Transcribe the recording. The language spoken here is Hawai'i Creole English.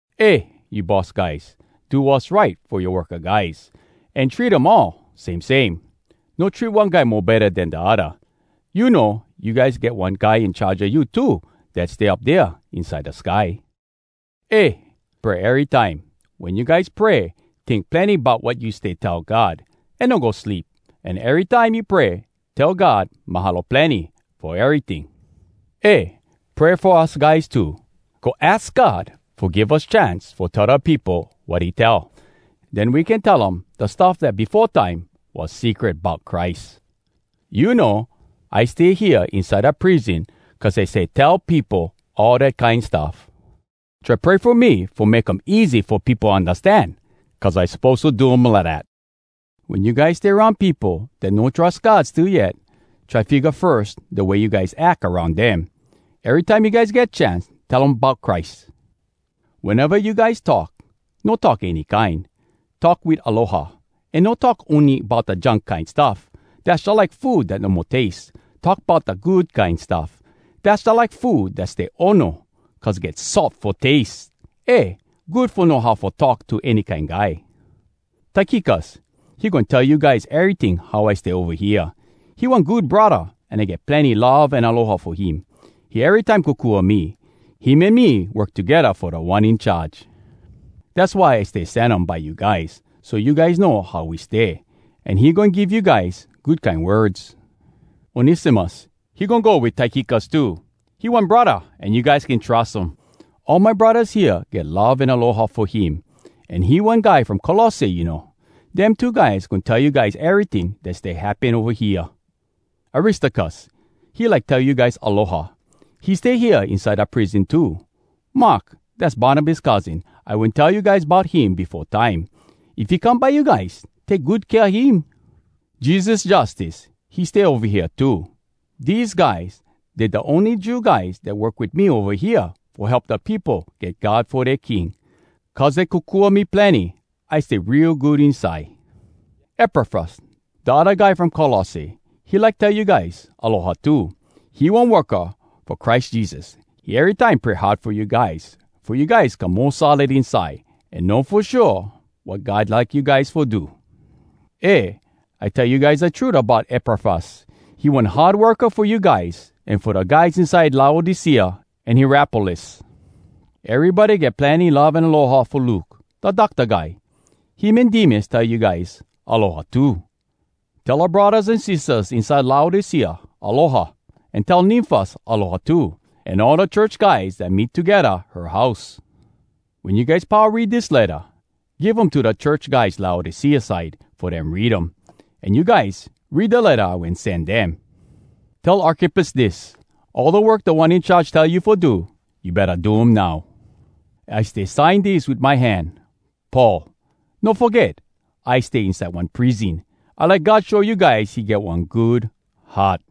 Eh, you boss guys, do wass right fo yoa worka guys, an treat um all same same. No treat one guy mo betta den da odda. You know, you guys get one Guy In Charge a you too dat stay up dea inside da sky. Eh, pray erytime. Wen you guys pray, tink plenny bout wat you stay tell God, an no go sleep. An erytime you pray, tell God “Mahalo plenny!” fo eryting. Eh, pray fo us guys too. Go aks God fo give us chance fo tell da peopo wat he tell. Den we can tell um da stuff dat befo time was secret bout Christ. You know, I stay hea inside da prison cuz I stay tell peopo all dat kine stuff. Try pray fo me fo make um easy fo peopo undastan cuz I suppose to do um lidat. Wen you guys stay aroun peopo dat no trus God still yet, try figga firs, da way you guys ack aroun dem. Erytime you guys get chance, tell um bout Christ. Weneva you guys talk, no talk any kine—talk wit aloha. An no talk ony bout da junk kine stuff. Dass jalike food dat no mo taste. Talk bout da kine good stuff. Dass jalike food dat stay ono, cuz get salt fo taste! Eh! Good fo know how fo talk to any kine guy. Tykikus, he goin tell you guys eryting how I stay ova hea. He one good braddah, an I get plenny love an aloha fo him. He erytime kokua me. Him an me work togedda fo Da One In Charge. Dass why I stay sen um by you guys, so you guys know how we stay, an he goin give you guys good kine words. Onesimus, he goin go wit Tykikus too. He one braddah, an you guys can trus um. All my braddahs hea get love an aloha fo him, an he one guy from Colosse, you know. Dem two guys goin tell you guys eryting dat stay happen ova hea. Aristarkus, he like tell you guys “Aloha!” He stay hea inside da prison too. Mark, dass Barnabas cousin, I wen tell you guys bout him befo time. If he come by you guys, take good kea him. Jesus Justus, he stay ova hea too. Dese guys, dey da ony Jew guys dat work wit me ova hea fo help da peopo get God fo dea king. Cuz dey kokua me plenny, I stay real good inside. Epafras, da odda guy from Colosse, he like tell you guys “Aloha!” too. He one worka fo Christ Jesus. He erytime pray hard fo you guys, fo you guys come mo solid inside an know fo shua wat God like you guys fo do. Eh, I tell you guys da trut bout Epafras. He one hard worka fo you guys an fo da guys inside Laodicea an Hierapolis. Erybody get plenny love an aloha fo Luke, da docta guy. Him an Demas tell you guys “Aloha” too. Tell oua braddahs an sistahs inside Laodicea “Aloha,” an tell Nymfas “Aloha” too, an all da church guys dat meet togedda her house. Wen you guys pau read dis letta, give um to da church guys Laodicea side fo dem read um, an you guys, read da letta I wen sen dem. Tell Arkippus dis: “All da work Da One In Charge tell you fo do, you betta do um now.” I stay sign dis wit my hand, “Paul.” No foget, I stay inside one prison. I like God show you guys he get one good heart!